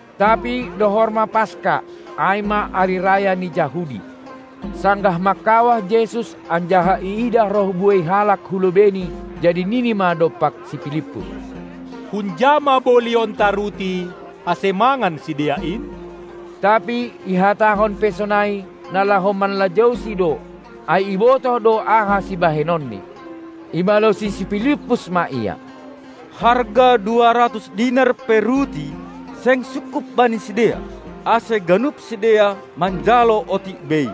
Tapi dohor ma Paska, ai ma ari raya ni Jahudi. Sanggah mangkawah Jesus anjaha iidah roh buei halak hu lobeiNi, jadi nini ma dompak si Pilippus: Hunja ma bolionta ruti, ase mangan sidea in? Tapi ihatahon pe sonai, na laho manlajousi do, ai ibotoh do aha sibahenonNi. Ibalosi si Pilippus ma Ia: Harga dua ratus dinar pe ruti seng sungkup bani sidea, ase ganup sidea manjalo otik bei.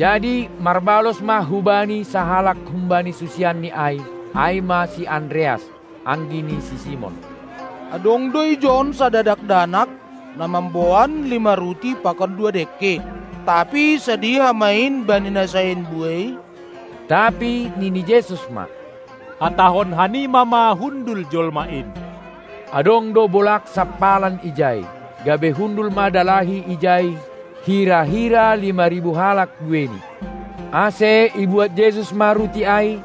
Jadi marbalos ma hubani sahalak humbani susianNi ai, ai ma si Andreas, anggi ni si Simon. Adong do ijon sada dakdanak, na mamboan lima ruti pakon dua dengke, tapi sadiha ma in bani na sain buei? Tapi nini Jesus ma: Hatahon hanima ma hundul jolma in! Adong do bolag sampalan ijai, gabe hundul ma dalahi ijai hira-hira lima ribu halak bueini. Ase ibuat Jesus ma ruti ai,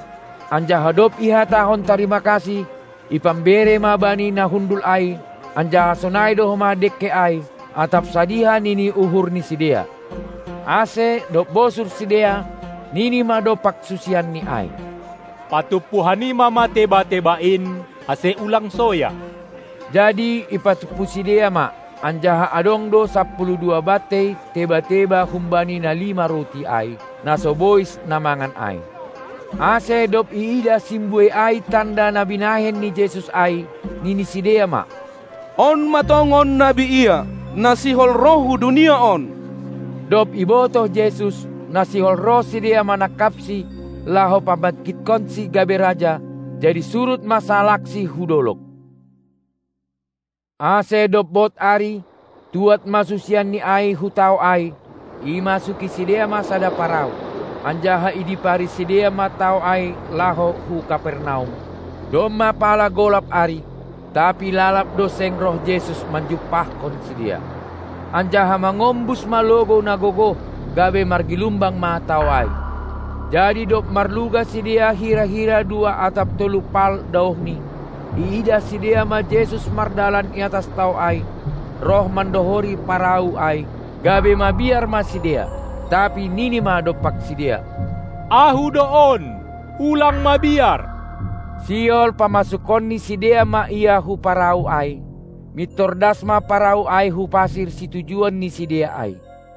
anjaha dob ihatahon tarima kasih, ipambere ma bani na hundul ai; anjaha sonai do homa dengke ai, atap sadiha nini uhur ni sidea. Ase dob bosur sidea, nini ma dompak susianNi ai: Patumpu hanima ma teba-teba in, ase ulang soya. Jadi ipatumpu sidea ma, anjaha adong do sapuluh dua bantei teba-teba humbani na lima ruti ai, na so bois na mangan ai. Ase dob iidah simbuei ai tanda na binahen ni Jesus ai, nini sidea ma: On ma tongon nabi ia, na sihol roh hu dunia on. dob ibotoh Jesus, na sihol roh sidea manangkapSi, laho pabangkithonSi gabe raja, jadi surut ma sahalakSi hu dolog. Ase dob bod ari, tuad ma susianNi ai hu tao ai. Imasuki sidea ma sada parau, anjaha idipari sidea ma tao ai laho hu Kapernaum. Domma pala golap ari, tapi lalab do seng roh Jesus manjumpahkon sidea. Anjaha mangombus ma logou na gogoh, gabe margilumbang ma tao ai. Jadi dob marluga sidea hira-hira dua atap tolu paal daohni, iidah sidea ma Jesus mardalan iatas tao ai, roh mandohori parau ai, gabe mabiar ma sidea. Tapi Nini ma dompak sidea: Ahu do on, ulang mabiar! Sihol pamasukon ni sidea ma Ia hu parau ai; mintor das ma parau ai hu pasir situjuon ni sidea ai.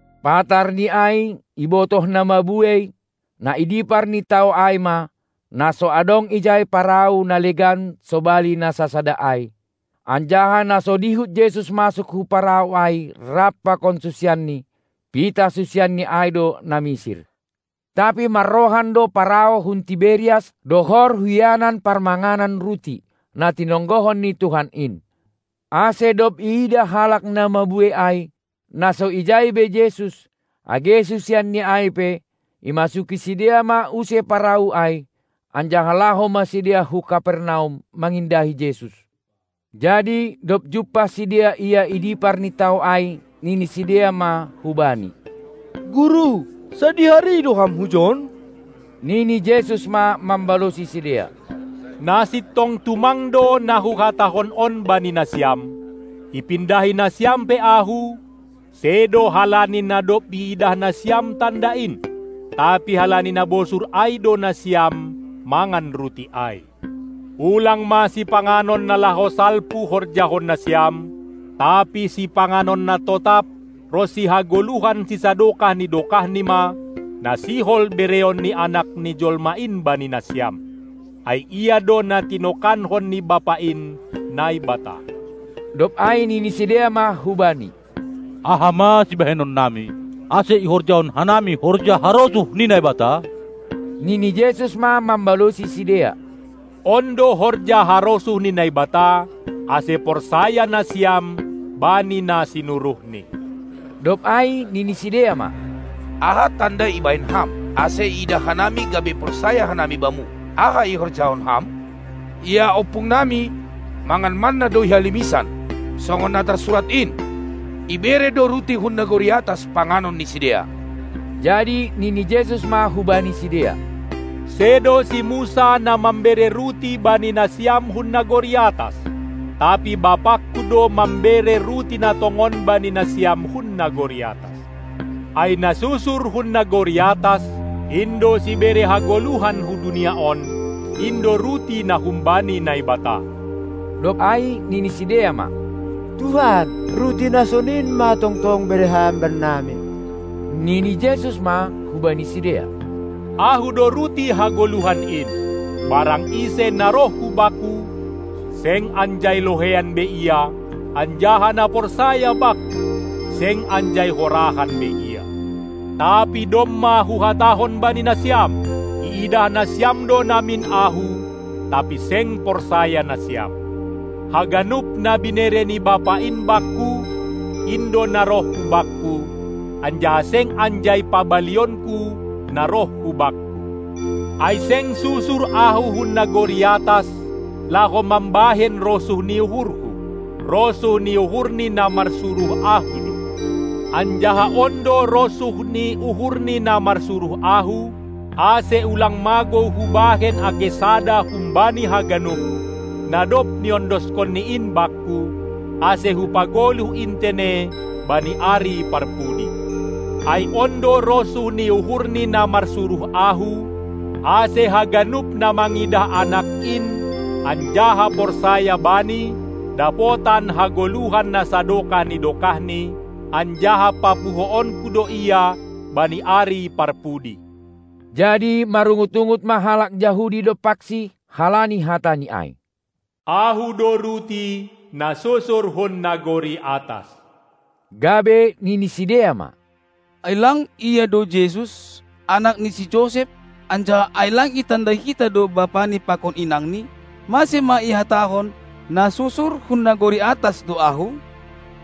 Patarni ai ibotoh na mabuei, na i dipar ni tao ai ma, na so adong ijai parau na legan sobali na sasada ai, anjaha na so dihut Jesus masuk hu parau ai rap pakon susianNi, pitah susianNi ai do na misir. Tapi marrohan do parau hun Tiberias dohor hu ianan parmanganan ruti, na tinonggohon ni Tuhan in. Ase dob iidah halak na mabuei ai, na so ijai be Jesus, age susianNi ai pe, imasuki sidea ma use parau ai, anjaha laho ma sidea hu Kapernaum mangindahi Jesus. Jadi dob jumpah sidea Ia i dipar ni tao ai, nini sidea ma hu-Bani: Guru, sadihari do Ham hujon? Nini Jesus ma mambalosi sidea: Na sintong tumang do na Huhatahon on bani nasiam, ipindahi nasiam pe Ahu, sedo halani na dob iidah nasiam tanda in, tapi halani na bosur ai do nasiam mangan ruti ai. Ulang ma sipanganon na laho salpu horjahon nasiam, tapi sipanganon na totap ronsi hagoluhan sisadokah ni dokahni ma, na sihol bereon ni Anak ni jolma in bani nasiam. Ai Ia do na tinokanhon ni Bapa in, Naibata. Dob ai nini sidea ma hu Bani: Aha ma sibahenon nami, ase ihorjahon hanami horja harosuh ni Naibata? Nini Jesus ma mambalosi sidea: On do horja harosuh ni Naibata, ase porsaya nasiam bani Na sinuruhNi. Dob ai nini sidea ma: Aha tanda ibahen Ham, ase iidah hanami gabe porsaya hanami Bamu? Aha ihorjahon Ham? Ia ompung nami, mangan manna do i halimisan, songon na tarsurat in: Ibere do ruti hun nagori atas panganon ni sidea. Jadi nini Jesus ma hubani sidea: Sedo si Musa na mambere ruti bani nasiam hun nagori atas, tapi BapangKu do mambere ruti na tongon bani nasiam hun nagori atas. Ai na susur hun nagori atas, in do sibere hagoluhan hu dunia on, in do ruti na humbani Naibata. Dob ai nini sidea ma: Tuhan, ruti na sonin ma tongtong bere Ham bannami. Nini Jesus ma hubani sidea: Ahu do ruti hagoluhan in. Barang ise na roh hu Bakku, seng anjai loheian be ia, anjaha na porsaya Bakku, seng anjai horahan be ia. Tapi domma Huhatahon bani nasiam: Iidah nasiam do namin Ahu, tapi seng porsaya nasiam. Haganup na binere ni Bapa in Bakku, in do na roh hu Bakku, anjaha seng anjai pabalionKu na roh hu Bakku. Ai seng susur Ahu hun nagori atas, laho mambahen rosuh ni uhurHu, rosuh ni uhur ni na marsuruh Ahu do. Anjaha on do rosuh ni uhur ni na marsuruh Ahu, ase ulang magou Hubahen age sada humbani haganup, na dob niondoskonNi in Bakku, ase Hupagoluh in tene bani ari parpudi. Ai on do rosuh ni uhur ni na marsuruh Ahu, ase haganup na mangidah Anak in anjaha porsaya Bani, dapotan hagoluhan na sadokah ni dokahni, anjaha papuhoonKu do ia bani ari parpudi. Jadi marungut-ungut ma halak Jahudi dompakSi halani hataNi ai: "Ahu do ruti, na susur hun nagori atas," gabe nini sidea ma: Ai lang Ia do Jesus, anak ni si Josep, anjaha ai lang itandai hita do bapani pakon inangni? Mase ma ihatahon: Na susur hun nagori atas do Ahu?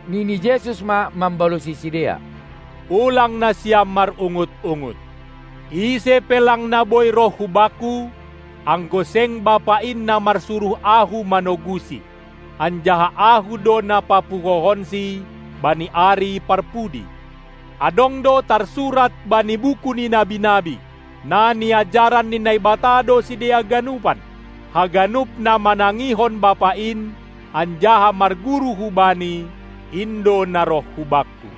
Nini Jesus ma mambalosi sidea: Ulang nasiam marungut-ungut! Ise pe lang na boi roh hu Bakku, anggo seng Bapa in, na marsuruh Ahu, manogusi; anjaha Ahu do na papuhohonsi bani ari parpudi. Adong do tarsurat bani buku ni nabi-nabi: Na niajaran ni Naibata do sidea ganupan. Haganup na manangihon Bapa in anjaha marguru hu Bani, in do na roh hu Bakku.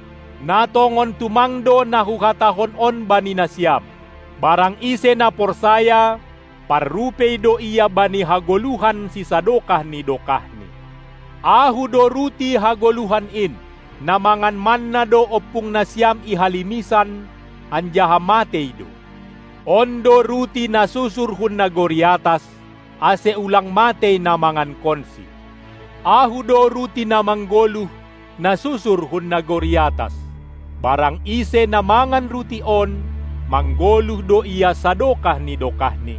Na tongon tumang do na Huhatahon on bani nasiam: Barang ise na porsaya, parrupei do ia bani hagoluhan sisadokah ni dokahni. Ahu do ruti hagoluhan in. Na mangan manna do ompung nasiam i halimisan, anjaha matei do. On do ruti na susur hun nagori atas, ase ulang matei na mangankonsi. Ahu do ruti na manggoluh, na susur hun nagori atas. Barang ise na mangan ruti on, manggoluh do ia sadokah ni dokahni.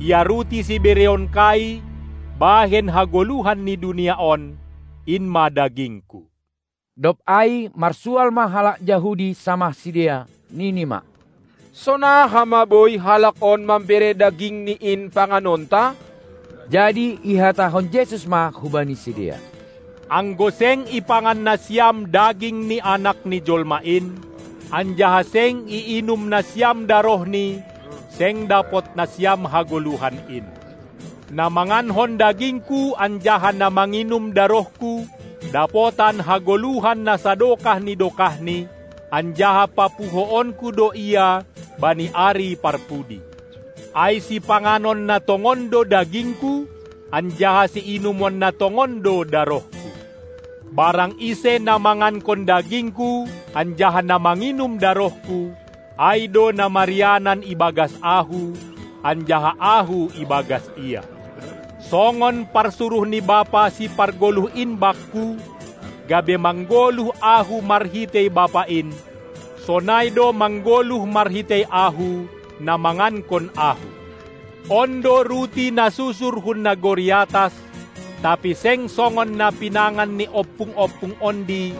Ia ruti sibereonKai bahen hagoluhan ni dunia on, in ma dagingKu. Dob ai marsual ma halak Jahudi samah sidea, nini ma: Sonaha ma boi Halak on mambere dagingni in panganonta? Jadi ihatahon Jesus ma hubani sidea: Anggo seng ipangan nasiam daging ni Anak ni Jolma in, anjaha seng iinum nasiam darohNi, seng dapot nasiam hagoluhan in. Na mangankon dagingKu anjaha na manginum darohKu dapotan hagoluhan na sadokah ni dokahni, anjaha papuhoonKu do ia bani ari parpudi. Ai sipanganon na tongon do dagingKu, anjaha siinumon na tongon do darohKu. Barang ise na mangankon dagingKu anjaha na manginum darohKu, ai do na marianan ibagas Ahu anjaha Ahu ibagas ia. Songon parsuruh ni Bapa Sipargoluh in Bakku, gabe manggoluh Ahu marhitei Bapa in, sonai do manggoluh marhitei Ahu na mangankon Ahu. On do ruti na susur hun nagori atas, tapi seng songon na pinangan ni ompung-ompung ondi,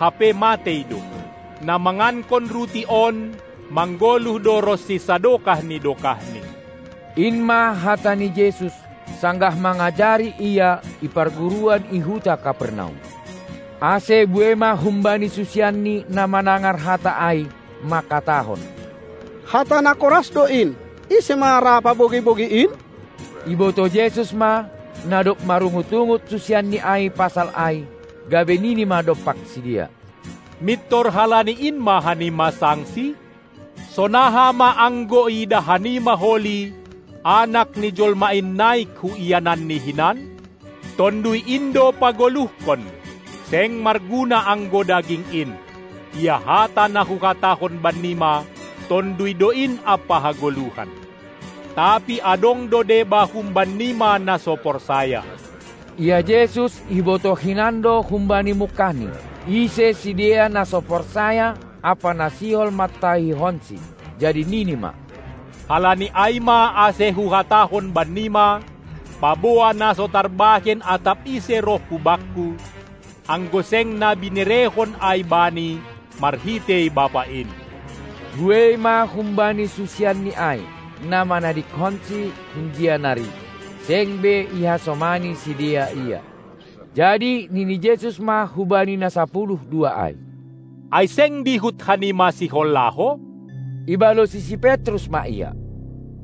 hape matei do. Na mangankon ruti on manggoluh do ronsi sadokah ni dokahni. In ma hata ni Jesus, sanggah mangajari Ia i parguruan i huta Kapernaum. Ase buei ma humbani susianNi na manangar hata ai, mangkatahon: Hata na koras do in, ise ma ra pabogei-bogei in? Ibotoh Jesus ma, na dob marungut-ungut susianNi ai pasal ai, gabe nini ma dompak sidea: Mintor halani in ma hanima sangsi? Sonaha ma anggo iidah hanima holi Anak ni jolma in naik hu iananNi hinan? Tonduy in do pagoluhkon, seng marguna anggo daging in. Ia hata na Huhatahon bannima, Tonduy do in ampa hagoluhan. Tapi adong do deba humban nima na so porsaya. Ia Jesus ibotoh hinan do humbani mungkahni, ise sidea na so porsaya ampa na sihol mantahihonSi. Jadi nini ma: Halani ai ma ase Huhatahon bannima, paboa na so tarbahen atap ise roh hu Bakku, anggo seng na binerehon ai bani marhitei Bapa in. Buei ma humbani susianni ai, na manadingkonsi hunjia nari, seng be ihasomani sidea Ia. Jadi nini Jesus ma hubani na sapuluh dua ai: Ai seng dihut hanima sihol laho? Ibalosi si Petrus ma Ia: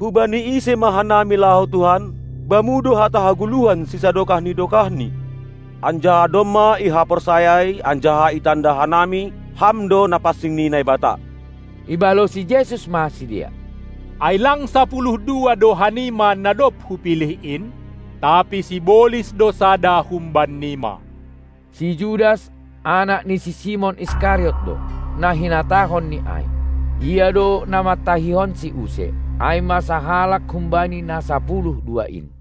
Hubani ise ma hanami laho Tuhan? Bamu do hata hagoluhan sisadokah ni dokahni! Anjaha domma ihaporsayai anjaha itanda hanami: Ham do Na pansing ni Naibata! Ibalosi Jesus ma sidea: Ai lang sapuluh dua do hanima, na dob Hupilih in? Tapi sibolis do sada humban nima. Si Judas, anak ni si Simon Iskariot do, na hinatahonNi ai. Ia do na mantahihonSi use, ai ma sahalak humbani na sapuluh dua in.